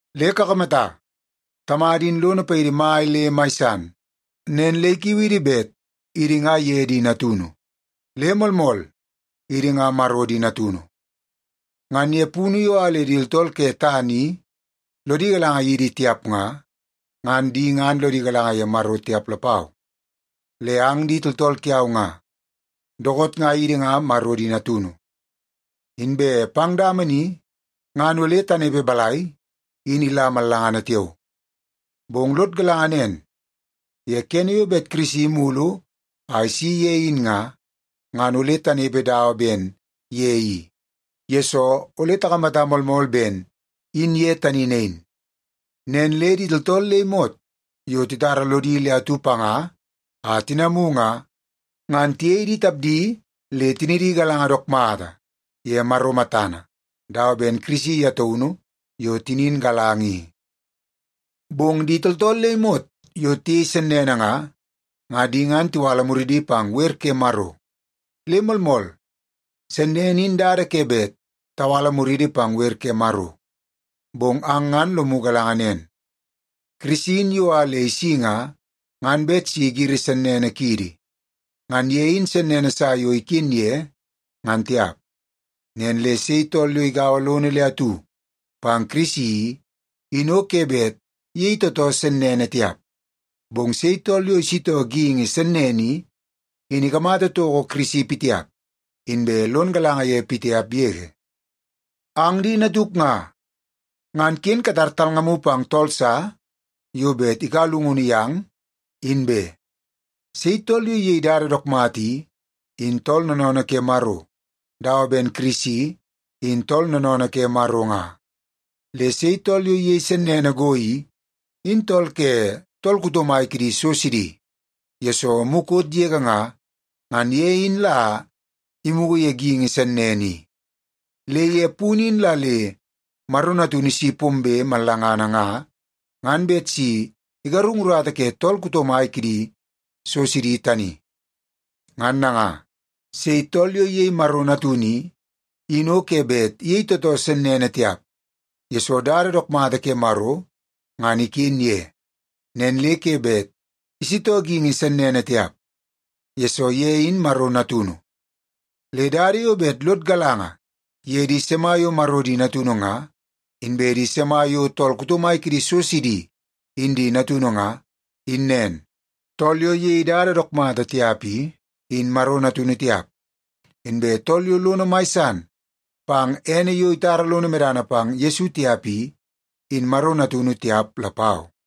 Le kakamata, Tamada in lono paidi mai le mai san! Nen le ikiu idi bet idi nga ye di natunu. Le moolmool, idi nga Maro di natunu. Ngan ye punu yo a le di tooltool ke tana i lodi galanga yidi tiap nga, ngan di ngan lodi galanga ye Maro tiap lapau. Le ang di tooltool kiau nga, dookoot nga idi nga Maro di natunu. Inbe pang dama ni ngan ole tanepe balai in ila mallangana tiao. Bong lod galanga nen ye kene yo bet Kirisi imulu a isi ye in nga, ngan ole tanepe dawa ben ye i, yesoo ole takamata moolmool ben in ye tani nain. Nen le di tooltool le imot yo titara lodi le atu panga a tinamu nga, ngan tiyei di tapdi le tinidi galanga dook mata ye Maro matana dawa ben Kirisi ye taunu yo tinin galanga i. Bong di tooltool le imot yo tiyei sennene nga, ngan di ngan tiwala muridi pang wer ke Maro. Le moolmool, sennene in dada ke bet tawala muridi pang wer ke Maro. Bong ang ngan lomu galanga nen, Kirisi in yo a le isi nga, ngan bet si igiri sennene kiidi. Ngan ye in sennene sa yo iken ye, ngan tiap. Nen le sei tool yo igaua lono le atu pang Kirisi i, in o ke bet iyei tootoo sennene tiap. Bong sei tool yo isitoo geingi sennene i, in ikamata toko Kirisi pitiap, inbe lon galanga ye pitiap yege. Ang di natuk nga, ngan ken katar talngamu pang tool sa yo bet ikaua llungunu yang, in be. Sei tool yo iyei dada dook mata i, in tool noonoonoo ke Maro dawa ben Kirisi in tool noonoonoo ke Maro nga. Le sei tool yo iyei sennene go i, in tool ke tool kuto mai kidi so sidi, yesoo mukot yege nga, ngan ye in la imugu ye geingi sennene i. Le ye punu in la le Maro Natunu isi pombe mallangana nga, ngan bet si igarung urata ke tool kuto mai kidi so sidi tani. Ngan nanga, sei tool yo iyei Maro Natunu i, in o ke bet iyei tootoo sennene tiap, yesoo dada dook mata ke Maro ngan iken ye. Nen le ke bet isitoo geingi sennene tiap, yesoo ye in Maro Natunu. Le dada yo bet lod galanga ye di sima yo Maro di natunu nga, inbe di sima yo tool kuto mai kidi so sidi in di natunu nga, in nen. Tool yo iyei dada dook mata tiap i, in Maro natunu tiap. Inbe tool yo lono mai san pang ene yo itara lono medana pang Yesu tiap i, in Maro natunu tiap lapau.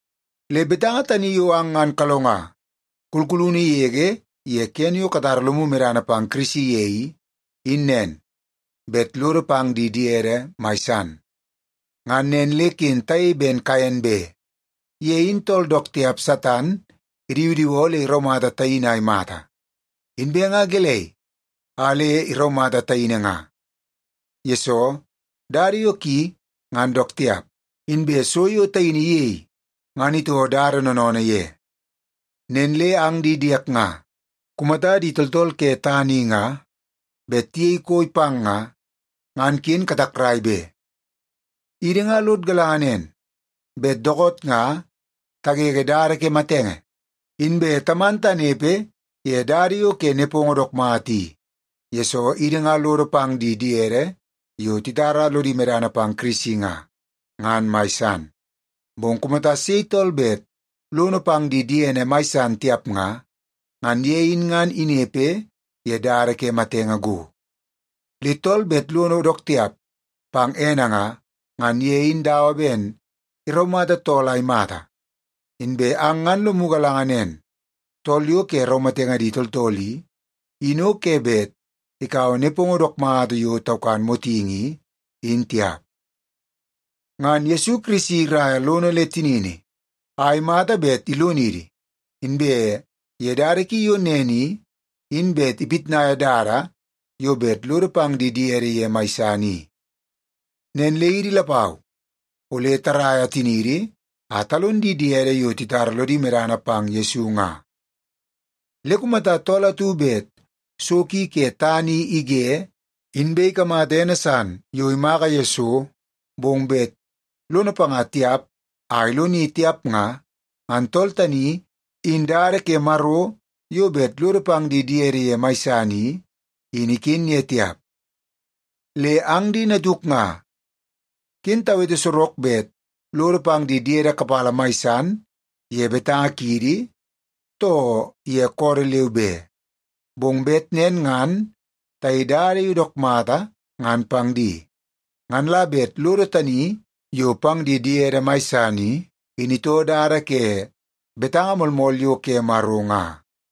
Le betanga tani yo ang ngan kalonga kulkulunu yege ye kene yo katara lomu medana pang Kirisi ye i, in nen; bet lodo pang di diede mai san. Ngan nen le ken tayei ben Kaen be. Ye in tool dook tiap Satan idiwidiwoo le iraumata taini a imata. Inbe nga gelei a le iraumata taini nga? Yesoo, dada yo ki ngan dook tiap, inbe so yo taini iyei ngan itoo dada noonoonoo ye. Nen le ang di diek nga, kumata di tooltool ke tana i nga bet tiyei koi pang nga, ngan ken katakrai be. Idi nga lod galanga nen, bet dookoot nga tagege dada ke matenge, inbe taman tanepe ye dada yo ke nepongo dook mata i, yesoo idi nga lodo pang di diede yo titara lodi medana pang Kirisi nga, ngan mai san. Bong kumata sei tool bet lono pang di diene mai san tiap nga, ngan ye in ngan inepe ye dada ke matenge go. Le tool bet lono dook tiap pang ene nga, ngan ye in dawa ben iraumata tool a imata. Inbe ang ngan lomu galanga nen, tool yo ke raumatenge di tooltool i, in o ke bet ikaua nepongo dook mata yo taukan motingi i, in tiap. Ngan Yesu Kirisi iraia lono le tinini a imata bet ilonidi, inbe ye dada ki yo nen i, in bet ipitnaia dada yo bet lodo pang di diede ye mai san i. Nen le idi lapau ole taraia tiniidi a talon di diede yo titara lodi medana pang Yesu nga. Le kumata tool atu bet so ki ke tana i ige, inbe ikamata ene san yo imaka ye so, bong bet lono panga tiap a iloni tiap nga, ngan tool tani in dada ke Maro yo bet lodo pang di diede ye mai san i, in iken ye tiap. Le ang di natuk nga, ken tawete sorok bet lodo pang di diede kapala mai san ye betanga kiidi, too ye koodoo leu be. Bong bet nen ngan tayei dada yo dook mata ngan pang di. Ngan la bet lodo tani yo pang di diede mai san i, in itoo dada ke betanga moolmool yo ke Maro nga.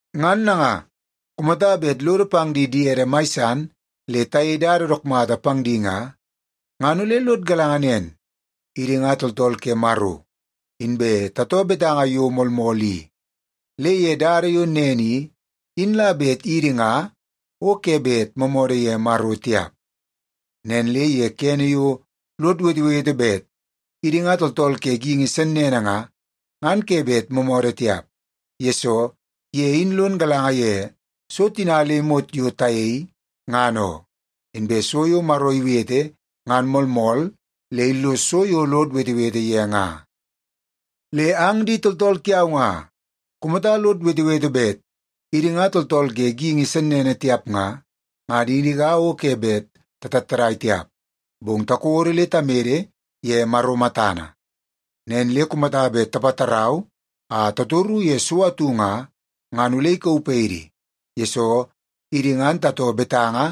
Ngan nanga, kumata bet lodo pang di diede mai san le tayei dada dook mata pang di nga, ngan ole lod galanga nen; idi nga tooltool ke Maro inbe tatoo betanga yo moolmool i. Le ye dada yo nen i, in la bet idi nga o ke bet moomoodoo ye Maro tiap. Nen le ye kene yo lod wetewete bet idi nga tooltool ke geingi sennene nga, ngan ke bet moomoodoo tiap, yesoo ye in lon galanga ye so tina le imot yo tayei, ngan oo. Inbe so yo Maro iwete ngan moolmool le illos so yo lod wetewete ye nga. Le ang di tooltool kiau nga, kumata lod wetewete bet idi nga tooltool ke geingi sennene tiap nga, ngan idi nga o ke bet tatattadai tiap, bong takodo le tamede ye Maro matana. Nen le kumata bet tapatarau a tatoru ye so atu nga, ngan ole ikauu paidi, yesoo idi ngan tatoo betanga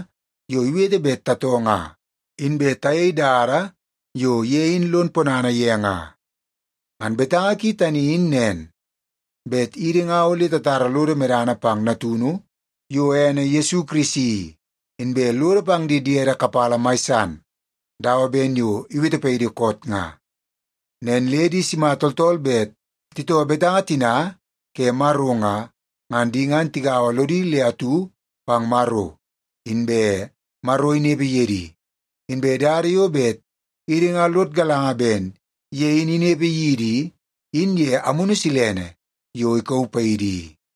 yo iwete bet tatoo nga, inbe tayei dada yo ye in lon ponana ye nga. Ngan betanga ki tani in nen; bet idi nga ole tatara lodo medana pang Natunu yo ene Yesu Kirisi i, inbe lodo pang di diede kapala mai san dawa ben yo iwete paidi koot nga. Nen le di sima tooltool bet titoo betanga tina ke Maro nga, ngan di ngan tigaua lodi le atu pang Maro, inbe Maro inepe ye di. Inbe dada yo bet idi nga lod galanga ben ye in inepe yidi i, in ye Amunu Silene yo ikauu paidi i.